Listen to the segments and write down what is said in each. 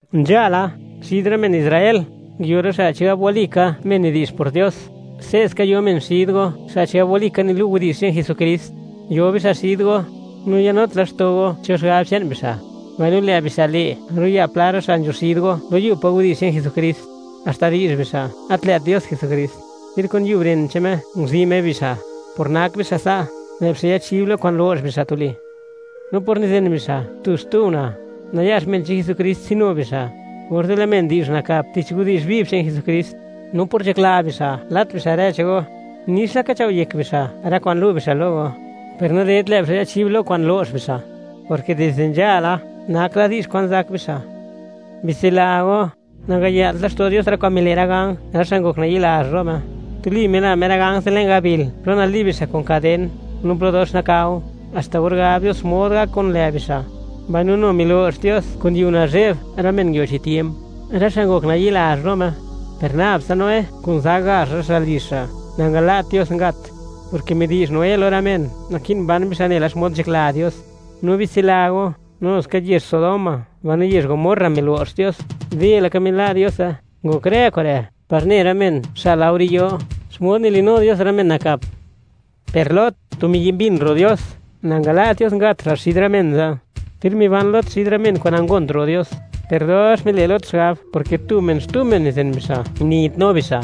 Nzhala, xid rë men Israel, nguio rë xa' chigab walika men nidi'zh por Dios; se'ska yo men xid go, xa' chigab walika nilu' widi'zh che'n Jesukrist. Yo bixa' xid go, no nayanut laxto' go cho xigab che'n bixa', mbaino lë' bixa' le', ro'ya' pla rë xa' nzho xid go lo yub pa' widi'zh che'n Jesukrist, haxta di'zh bixa', gat lë't Dios Jesukrist, ter kun yub ren che'n Me nguzi' Me bixa'. Por nak bixa' sa', lë' bixa' yachib lo kwa'n lo'x bixa' tuli; no por nizen bixa' tu-xtu una', nayax men che'n Jesukrist tsinu bixa', orze' lë' men di'zh nakap tich widi'zh viv che'n Jesukrist. No por nzhakla bixa' lat bixa' rë che'n go, nix laka chao' yek bixa' rë kwa'n lu' bixa' lo go, per nadedt lë' bixa' yachib lo kwa'n lo'x bixa', porke dizde nzhala, nak la di'zh kwan zak bixa'. Bitsila go, nangaya'lt laxto' Dios rë kwa'n mile' rë ganj, rë xa' ngok nayi'lazh lo Me; tuli mila Me rë ganj ze' le'n gabil plo nali'b bixa' kun kaden, no plo dox nakao, haxta or gab Dios xmod gak kun lë' bixa'. Mbaino nu milo'x Dios kun yiu nazhe'b rë men nguio chi tiemp, rë xa' ngok nayi'lazh lo Me. Per nab tsa Noé kun za gazh rë xa' lizh xa' nangala't Dios ngat, porke midi'zh Noé lo rë men, naki'n ban bixa' nela xmod nzhakla Dios. No bitsila go, nu ska yezh Sodoma mbaino yezh Gomorra milo'x Dios, de laka mila' Diose. Ngok rë kure' par ne rë men xa' laore yo, xmod nili'nu Dios rë men nakap. Per Lot, tu miyi' mbin ro' Dios, nangala't Dios ngat xa' xid rë men ze'. Ter miban Lot xid rë men kwa'n nangont ro' Dios, per dox mile' Lot xigab, porke tu men-xtu men nizen bixa', niyitnu bixa'.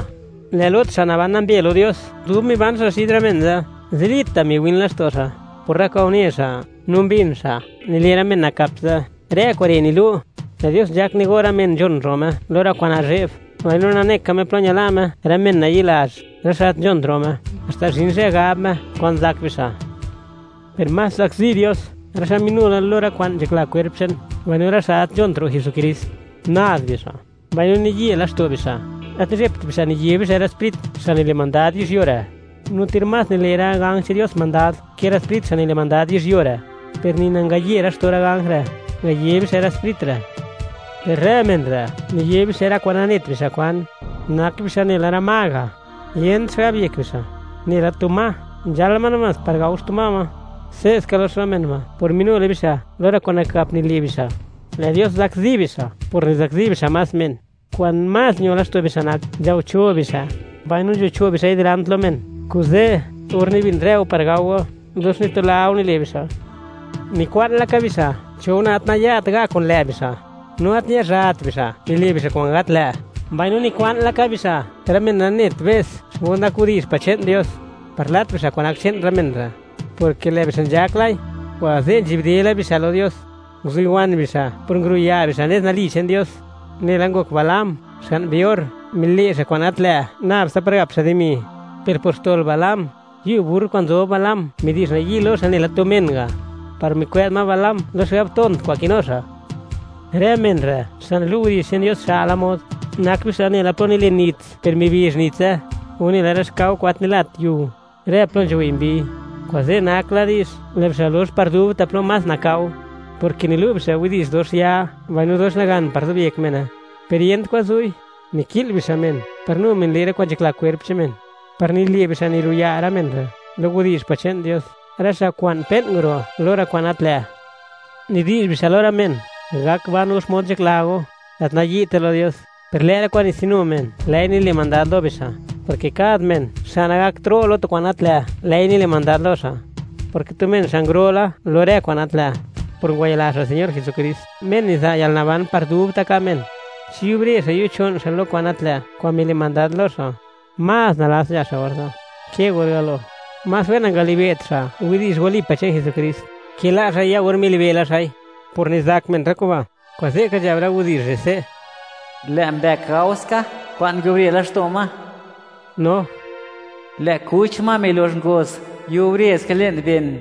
Lë' Lot, xa' naban nambe lo Dios, dub miban xa' xid rë men ze', zilita' miwin laxto' xa', por rë kwa'n une xa' no mbin xa', nile' rë men nakap ze'. Rë kure' nilu', lë' Dios nzhak nigo' rë men nzhon ro' Me lo rë kwa'n nazhe'b, mbaino nane ka Me plo ñala' Me rë men nayi'lazh, rë xa' gat nzhont ro' Me, haxta zhin zhë gab Me xkwan zak bixa'. Per más zakzi Dios rë xa' minu la lo rë kwa'n nzhakla kwerp che'n, mbaino rë xa' gat nzhont ro' Jesukrist. Nad bixa', mbaino niye laxto' bixa', gat nizhebt bixa' niye bixa' rë sprit, xa' nile' mandad yizhyuo re'. No ter más nile' rë ganj che'n Dios mandad ke rë sprit xa' nile' mandad yizhyuo re', per ni nangaye laxto' rë ganj re', ngaye bixa' rë sprit re'. Per rë men re', niye bixa' rë kwa'n nanet bixa' kwan. Nak bixa' nela rë ma ga'; yent xigab yek bixa'; nela tu ma, nzhaal ma namás par gao xtu ma ma. Se'ska lox rë men ba' por minu la bixa' lo rë kwa'n nakap nile' bixa'. Lë' Dios zakzi bixa' por nizakzi bixa' más men. Kwa'n más ño laxto' bixa' nak, nzhao cho' bixa' mbaino nzho cho' bixa'i dilant lo men; kuze', or nibin rë go par gao go, dox nitula go nile' bixa'. Nikwa'n laka bixa' cho una' gat naya't ga' kun lë' bixa', no gat ñazhat bixa', nile' bixa' kwa'n gat lë'; mbaino nikwa'n laka bixa' rë men nanet be's xmod nak widi'zh pa' che'n Dios, par lat bixa' kwa'n nak che'n rë men re', porke lë' bixa' nzhak lai, kuze' nzhi'bde la bixa' lo Dios. Nguziwan bixa' por nguruya' bixa' nez nali che'n Dios, nela ngok Balaam, xga'n Beor; mile' xa' kwa'n gat lë' nab tsa par gap xa' dimi. Per por xtol Balaam, yub burr kwa'n nzob Balaam midi'zh nayi' lo xa' nela tu men ga', par mikwë'z ma Balaam lo xigab tont kwa'n kinu xa'. Rë men re', xa' nilu' widi'zh che'n Dios xa'la mod, nak bixa' nela plo nilen nits per mibizh nitse, o nela rë xkao kwa'n gat nilat yiu, rë plo nzhuwei' mbiy. Kuze', nak la di'zh, lë' bixa' lox par dubta' plo más nakao, porke nilu' bixa' widi'zh dox ya mbaino dox nagan par zobyek mene, per yent kwan zu'i; niki'l bixa' men par nu men le' rë kwa'n nzhakla kwerp che'n men, par nile' bixa' niru'ya' rë men re' lo widi'zh pa' che'n Dios, rë xa' kwa'n pe'n nguro' lo rë kwa'n gat lë'. Nidi'zh bixa' lo rë men: “Gak ban go xmod nzhakla go, gat nayi'te lo Dios”, per lë' rë kwa'n nitsinu men lë'i nile' mandad lo bixa', porke kad men xa' nagak ro' lo tu kwa'n gat lë', lë'i nile' mandad lo xa', porke tu men xa' nguro' la lo rë kwa'n gat lë', por ngwayila xa' Señor Jesukrist, Me niza' yalnaban par dubta' ka' men; chi yubre xa' yocho'n xa' lo kwa'n gat lë', kwa'n mile' mandad lo xa', más nalats nzha xa' orze', ke or galo. Más wen nangalibe't xa' widi'zh wali pa' che'n Jesukrist ke la' xa'i or ya milibe' la xa'i. Por nizak men rë kuba', kuze'ka nzhab rë widi'zh re' se': “Lë' mbëk gao ska kwa'n nguiubre laxto' ma, no, lë' kuch ma milox ngoz, yubre ska le'n ben.”